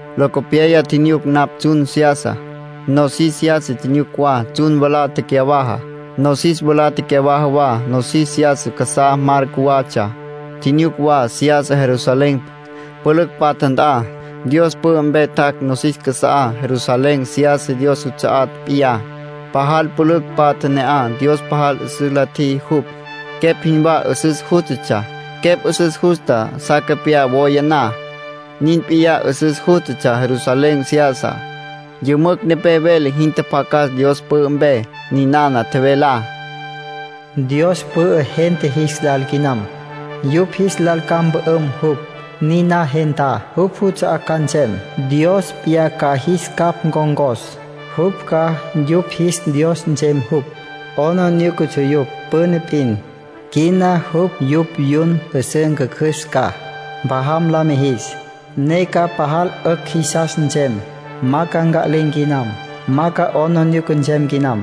Locopyaya tjinyuc napj tsjun seyasa, nosis seyasa tjinyuc wa. Tsjun mwalá tecyawaja, nosis mwalá tecyawaja wa. Nosis seyasa casá, mar cjuwatsja. Tjinyuc wa seyasa Jerusalén, pülücj patja nt'a. Dios pü'ü mpe tjac' nosis casa'á. Jerusalén Seyasa Dios juts'a'á p'iyá. Pajal pülücj patja ne'aj. Dios pajal 'üsüs la tjiji jupj. Quepj jinwá 'üsüs jústatsja, quepj 'üsüs justa sa capyá woya na, nin p'iyá 'üsüs jústatsja Jerusalén Seyasa. Yümücj nepé vele jin tjapjacas Dios pü'ü mpe. Ninana tjevelá: “Dios pü'ü gente jis lal quinam. Yupj jis lal ca mpü'üm jupj. Niná gentá, jupj juts'a'á ca nsem. Dios p'iyá ca jis capj ncon̈cos. Jupj ca yupj jis Dios nsem jupj. 'Aplijílatsja yupj püna p'in; quina jupj yupj yun 'üsǘ ncjücjüs ca, mpjajam la mijis, ne ca pajal 'ücj jisas nsem. Ma ca nca'lin̈ quinam. Ma 'aplijila nsem quinam,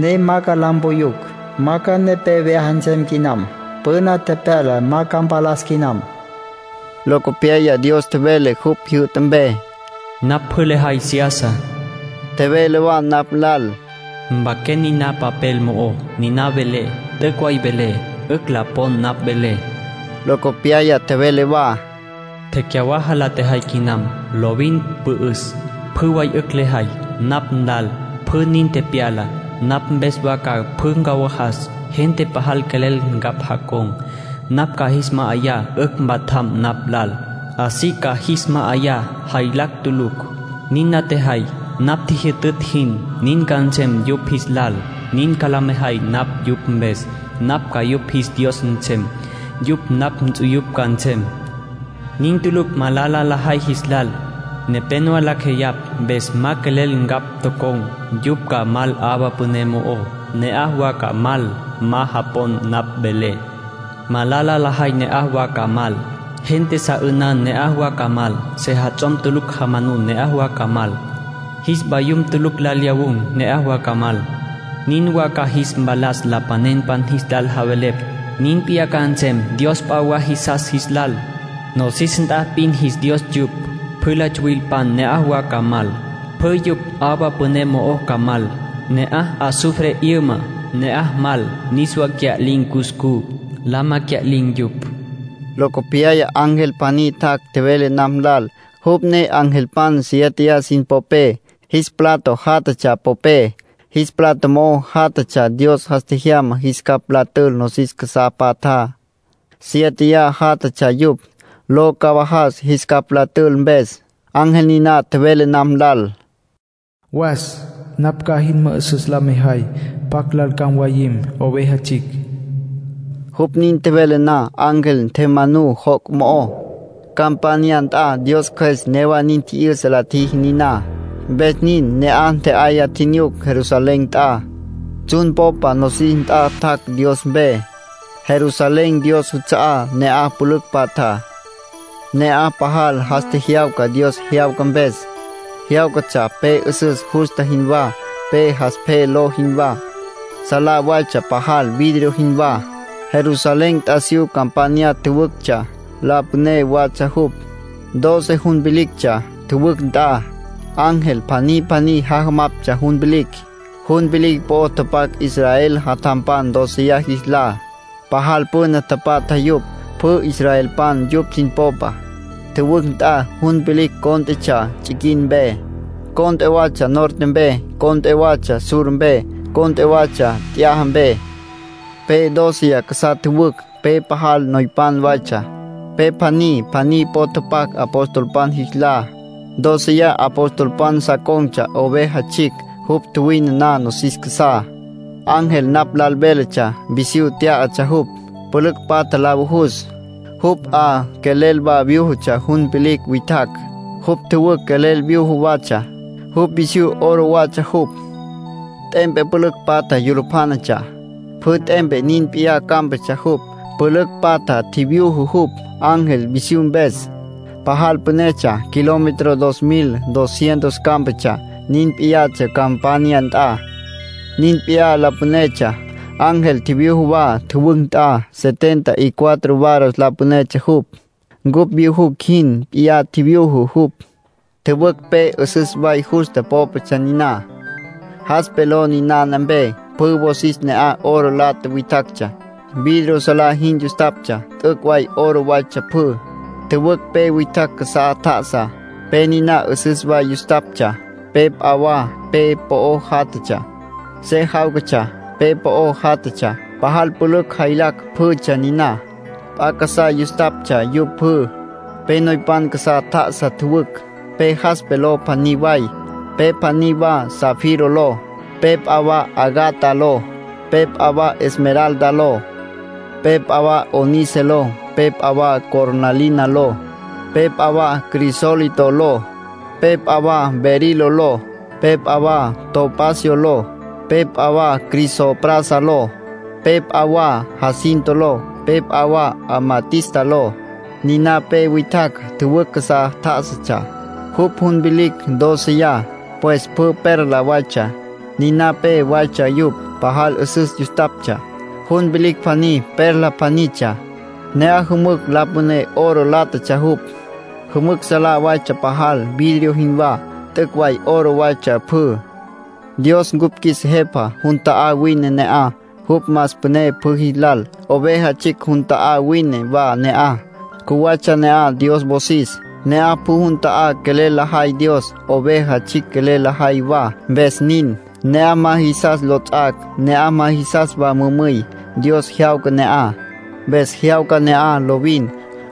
ne ma ca la mpuyucj. Ma ca nepé vyaja nsem quinam. Püna tepyala ma ca mpalas quinam”, nin tjevele tjapjacas. Locopyaya Dios tjevele jupj jyü'ta mpe: “Napj pjü lejay seyasa”. Tjevele wa napj lal: “Mpaquen niná papel mo'ó: ‘Ninana velé, t'üc' way velé. 'Ücj la pon napj velé.’” Locopyaya tjevele wa: “Tecyawaja la tjejay quinam. Lovin pü'üs, pjü way 'ücj lejay. Napj nlal pjü nin tepyala, napj mpes wa ca pjü ncawajas. Gente pajal quelel ncapj jacon̈, napj ca jis ma'ayá 'ücj mpatjam napj lal. Así ca jis ma'ayá, jaylacj tulucj. Nin la tjajay, napj tjijyütütj jin, nin ca nsem yupj jis lal; nin ca la mejay napj yupj mpes. Napj ca yupj jis Dios nsem. Yupj napj nts'uyupj ca nsem. Nin tulucj malala lajay jis lal. Nepénowa lacj jeyapj mpes ma quelel ncapj tocon̈. Yupj ca mal 'awa püné mo'ó. Ne'aj wa ca mal ma japon napj velé. Malala lajay ne'aj wa ca mal. Gente sa 'ünan ne'aj wa ca mal. Sejats'om tulucj jamanun ne'aj wa ca mal. Jis vayum tulucj lal lyawun̈ ne'aj wa ca mal. Nin wa ca jis mpalas lapanenpan jis lal javelepj. Nin p'iyá ca nsem dios p'a wa jisas jis lal. (Nosis nt'a p'in jis dios yupj.) Pjü la tsuwilpan ne'aj wa ca mal. Pjü yupj 'awa püné mo'o ca mal. Ne'aj azufre 'yüma. Ne'aj mal, niswa cya'lin̈ cuscú. Lama cya'lin̈ yupj.” Nin tjevele Dios. Locopyaya ángel pjaní tjac', tjevele napj lal. Jupj ne angelpan siéteya sin popé, jis plato jatatsja popé. Jis plato mo'ó jatatsja Dios jas tjejyama jis capj la tül nosis casá patjá. Siéteya jatatsja yupj, lo cawajas jis capj la tül mpes. Ángel niná tjevele napj lal: “Was. Napj ca jin mü'üsüs la mejay pjacj lal ca mwayim Oveja Tsjicj.” Jupj nin tjevele na, ángel ntjemanú joc' mo'ó, campanya nt'a. Dios Cjües newa nin tji'yüsa la tjiji niná, mpes nin. Ne'aj ntje'aya tjinyuc Jerusalén nt'a. Tsjun popa nosis nt'a tjac' Dios mpe. Jerusalén Dios juts'a'á. Ne'aj pülücj patja. Ne'aj pajal jas tjejyawca Dios jyawca mpes. Jyáwcatsja pe 'üsüs justa jinwá, pe jaspe ló jinwá. Salá waytsja pajal, vidrio jinwá. Jerusalén t'asiyú campanya tjüwüctsja, la püné watsja jupj. Doce jun vilictsja, tjüwücj nt'a. Angelpan pjaní pjaní jajamaptsja jun vilicj. Jun vilicj po'o tapac Israel jatjampan dóceya jis lá. Pajal püna tapatja yupj. Pjü israelpan yupj sin popa. Tjüwücj nt'a jun vilicj cónt'etsja tsiquin mpe, cont'e watsja norte mpe, cont'e watsja sur mpe, cont'e watsja t'yaja mpe. Pe dóceya casá tjüwücj. Pe pajal noypan waytsja. Pe pjaní pjaní po'o tapac apostolpan jis lá. Dóceya apostolpan sa con̈tsja Oveja Tsjicj, jupj tjuwine na nosis casá. Ángel napj lal véletsja, visyú tyá'atsja jupj, pülücj patja la vujus. Jupj 'a quelel wa vyújutsja jun vilicj witjacj, jupj tjüwücj quelel vyuju watsja. Jupj visyú oro watsja jupj. T'empe pülücj patja yulupjánatsja. Pjü t'empe nin p'iyá cámpatsja jupj. Pülücj patja tjivyuju jupj, ángel, visyú mpes. Pajal pünetsja. Kilómetro dos mil, dos cientos cámpatsja. Nin p'iyatsja campanya nt'a. Nin p'iyá la pünetsja. Ángel tjivyuju wa tjüwücj nt'a. Sesenta y cuatro varas la pünetsja jupj. Cupj vyujucj jin p'iyá tjivyuju jupj. Tjüwücj pe 'üsüs way justa pópatsja niná. Jaspe ló ninana pe. Pjü wosis ne'aj oro lata witjactsja, vidrio salá jin yustaptsja. T'üc' way oro waytsja pjü. Tjüwücj pe witjacj casá tjá'asa. Pe niná 'üsüs way yustaptsja. Pe p'a wa pe po'o játjatsja, se jáwcatsja. Pe po'o játjatsja, pajal pülücj jaylacj pjütsja niná. P'a casá yustaptsja yupj pjü. Pe noypan casá tjá'asa tjüwücj, pe jaspe ló pjaní way. Pe pjaní wa zafiro ló. Pe p'a wa ágata ló. Pe p'a wa esmeralda ló. Pe p'a wa ónice ló. Pe p'a wa cornalina ló. Pe p'a wa crisólito ló. Pe p'a wa berilo ló. Pe p'a wa topacio ló. Pe p'a wa crisoprasa ló. Pe p'a wa jacinto ló. Pe p'a wa amatista ló. Niná pe witjacj, tjüwücj casá tjá'asatsja. Jupj jun vilicj dóceya, pues pjü perla waytsja, niná pe waytsja yupj. Pajal 'üsüs yustaptsja. Jun vilicj pjaní perla pjanitsja. Ne'aj jümücj la püné oro látatsja jupj. Jümücj salá waytsja pajal, vidrio jinwá. T'üc' way oro waytsja pjü. Dios cupj qjuis Jepa, jun ta'á wine ne'aj. Jupj más püné pjü jis lal. Oveja Tsjicj jun ta'á wine wa ne'aj. Cjuwatsja ne'aj Dios wosis. Ne'aj pjü jun ta'á quelel lajay Dios, Oveja Tsjicj quelel lajay wa, mpes nin. Ne'aj ma jisas lots'ac'. Ne'aj ma jisas mümüy. Dios jyawca ne'aj. Mpes jyawca ne'aj lovin.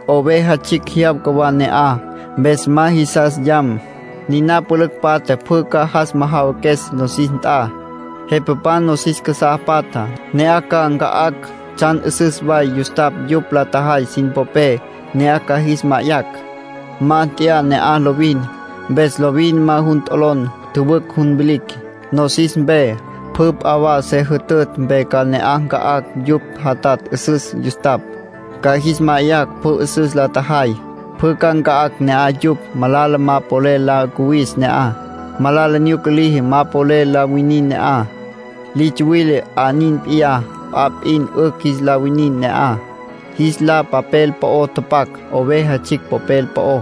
Oveja Tsjicj jyawca wa ne'aj, mpes ma jisas yam. Niná pülücj patja pjü ca jas majawaques nosis nt'a. Jepapan nosis casá patjá, ne'aj ca nca'acj tsjan 'üsüs way yustapj yupj la tjajay sin popé. Ne'aj ca jis ma'ayacj. Ma t'yaja ne'aj lovin. Mpes lovin ma jun t'olon tjüwücj jun vilicj. Nosis mpe, pjü p'a se jütütj mpe ca ne'aj nca'acj yupj jatatj 'üsüs yustapj, ca jis ma'ayacj. Pjü 'üsüs la tjajay, pjü ca nca'acj ne'aj yupj. Malala ma polel la cuwis ne'aj. Malala nyuca liji ma polel la winin ne'aj. Li tsuwile 'a nin p'iyá. P'a p'in 'ücj jis la winin ne'aj. Jis lá papel po'o tapac, Oveja Tsjicj popel po'ó,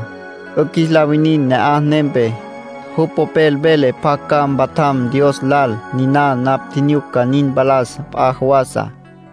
'ücj jis la winin ne'aj nempe. Jupj popel vele pjac ca mpatjam Dios lal. Niná napj tjinyuc ca nin mpalas p'a jawasa.